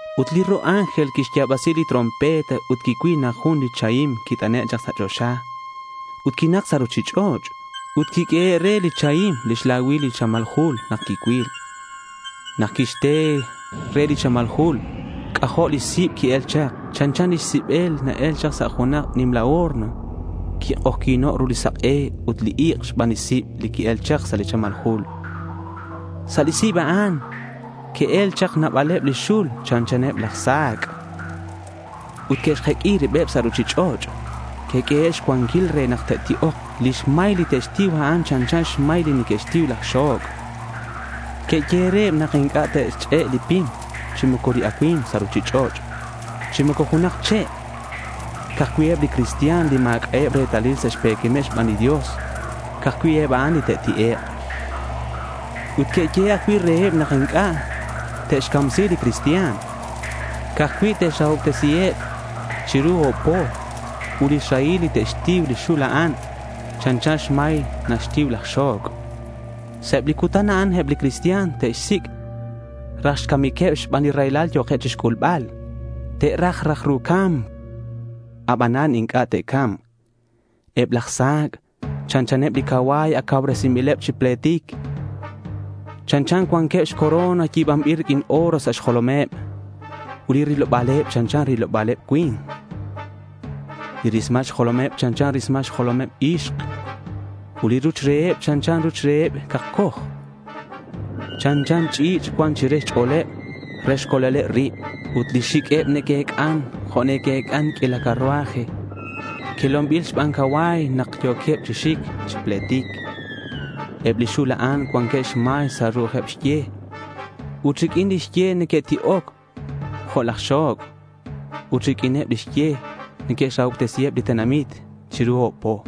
Ut li ro' ángel quixya̱basi lix trompeta ut quicuil nak jun li chahim quit'ane' chak sa' choxa ut quinak sa' ruchich'och'. Ut quiq'uehe' re li chahim lix lacuil li chamal jul nak quicuil. Nak quixte li re li chamal jul, c'ajo' li sib qui-el chak. Chanchan li sib li na-el sa' junak nimla horno. Quik'ojyi̱no' ru li sak'e ut li ik' xban li sib li qui-el chak sa' li chamal jul. Sa' li sib a'an que'el chak nabaleb li xul chanchaneb laj sa̱c' ut que'xjeq'ui ribeb sa' ruchich'och'. Que'q'uehe' xcuanquil re nak te'ti'ok. Lix may li te'xtiu, a'an chanchan xmay li neque'xtiu laj xo̱c'. Que'yehe' reheb nak inc'a' te'xch'e' li pim chi moco li acui̱mk sa' ruchich'och', chi moco junak che'. Ca'aj cui' eb li cristian li ma̱c'a' retalileb sa' xpe̱quemeb xban li Dios, ca'aj cui' eb a'an li te'ti'ek'. Ut que'yehe' ajcui' reheb nak inc'a' te'xcamsi li cristian. Ca'aj cui' te'xrahobtesiheb chiru o̱b po. Ut lix rahil li te'xtiu li xul a'an, chanchan xmay naxtiu laj xo̱c'. Sa' eb li cutan a'an, eb li cristian te'xsic' raj xcamiqueb xban li raylal yo̱keb chixc'ulbal. Te'xra raj ru ca̱mc, abanan inc'a' te'ca̱mk. Eb laj sa̱c' chanchaneb li cacua̱y ac cauresinbileb chi pletic. Chanchan cuanqueb xcorona yi̱banbil riq'uin oro sa' xjolomeb. Ut li riloba̱leb chanchan riloba̱leb cui̱nk. Li rismal xjolomeb chanchan rismal xjolomeb ixk ut li ruch reheb, chanchan ruch reheb cakcoj. Chanchan ch'i̱ch' cuan chire xch'o̱leb re xcolbaleb rib. Ut lix xiq'ueb neque'ec'an jo' neque'ec'an q'uila carruaje quelonbil xban cacua̱y nak ac yo̱queb chi xic chi pletic. Eb li xul a'an cuanqueb xmay sa' ru'ujeb xye. Ut riq'uin lix ye neque'ti'oc jo' laj xo̱c'. Ut riq'uineb lix ye te'xrahobtesiheb li tenamit chiru o̱b po.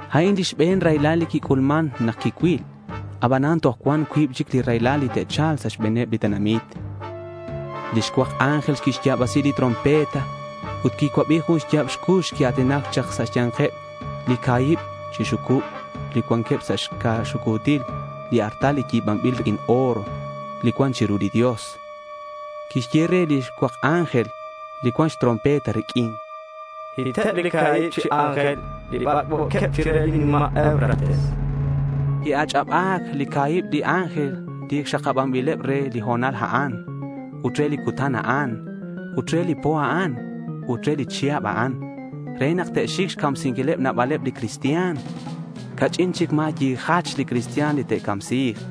A'in li xbe̱n raylal li quic'ulman nak quicuil. Abanan toj cuan cuib chic li raylal li te'cha̱lk sa' xbe̱neb li tenamit. Li xcuak ángel quixya̱basi lix trompeta ut quicuabi jun xya̱b cux quia̱tinac chak sa' xya̱nkeb li ca̱hib chi xucub li cuanqueb sa' xca̱ xucu̱til li artal li yi̱banbil riq'uin oro, li cuan chiru li Dios. Quixye re li xcuak ángel li cuan xtrompeta riq'uin: —Hiteb li ca̱hib chi ángel li bac'bo̱queb chire li nima' Eufrates, chan. Que'ach'aba̱c li ca̱hib chi ángel li ac xakabanbileb re li ho̱nal a'an ut re li cutan a'an ut re li po a'an ut re li chihab a'an re nak te'xic xcamsinquileb nabaleb li cristian. Ca'ch'in chic ma̱ yijach li cristian li te'camsi̱k.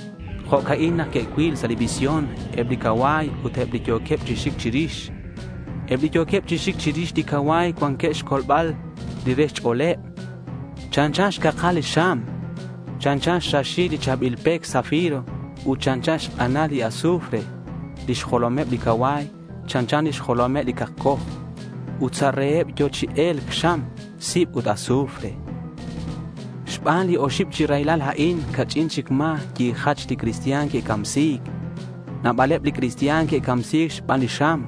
Jo'ca'in nak que'cuil sa' li visión eb li cacua̱y ut eb li yo̱queb chi xic chirix. Eb li yo̱queb chi xic chirix li cacua̱y cuanqueb xcolbal li re xch'o̱leb. Chanchan xcakal li xam, chanchan xraxil li cha̱bil pec zafiro ut chanchan xk'anal li azufre. Lix jolomeb li cacua̱y chanchan lix jolomeb li cakcoj. Ut sa' reheb yo̱ chi e̱lc xam, sib ut azufre. Xban li oxib chi raylal a'in ca'ch'in chic ma̱ yijach li cristian que'camsi̱c. Nabaleb li cristian que'camsi̱c xban li xam,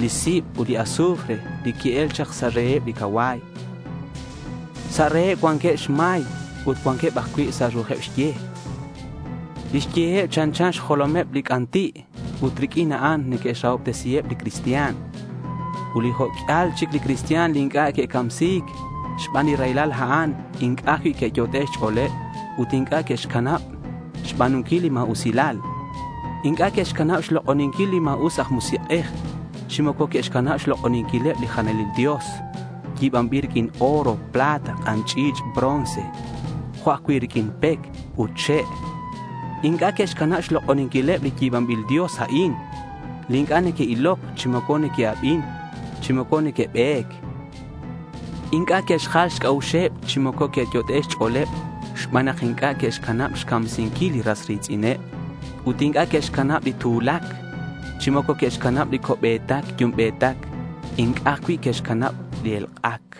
li sib ut li azufre li qui-el chak sa' reheb li cacua̱y. Sa' reheb cuanqueb xmay ut cuanqueb ajcui' sa' ru'ujeb xye. Lix yeheb chanchan xjolomeb li c'anti' ut riq'uin a'an neque'xrahobtesiheb li cristian. Ut li jo' q'uial chic li cristian li inc'a' que'camsi̱c xban li raylal a'an inc'a' ajcui' que'yot'e' xch'o̱leb ut inc'a' que'xcanab xba̱nunquil li ma̱usilal. Inc'a' que'xcanab xlok'oninquil li ma̱us aj musik'ej chi moco que'xcanab xlok'oninquileb li jalanil dios yi̱banbil riq'uin oro, plata, k'an ch'i̱ch' bronce jo' ajcui' riq'uin pec ut che'. Inc'a' que'xcanab xlok'oninquileb li yi̱banbil dios a'in, li inc'a' neque'iloc, chi moco neque'abin, chi moco neque'be̱c. Inc'a' que'xjal xc'a'uxeb chi moco que'yot'e' xch'o̱leb xban nak inc'a' que'xcanab xcamsinquil ras ri̱tz'ineb ut inc'a' que'xcanab li tu̱lac, chi moco que'xcanab li co'be̱tac yumbe̱tac ut inc'a' ajcui' que'xcanab li elk'ac.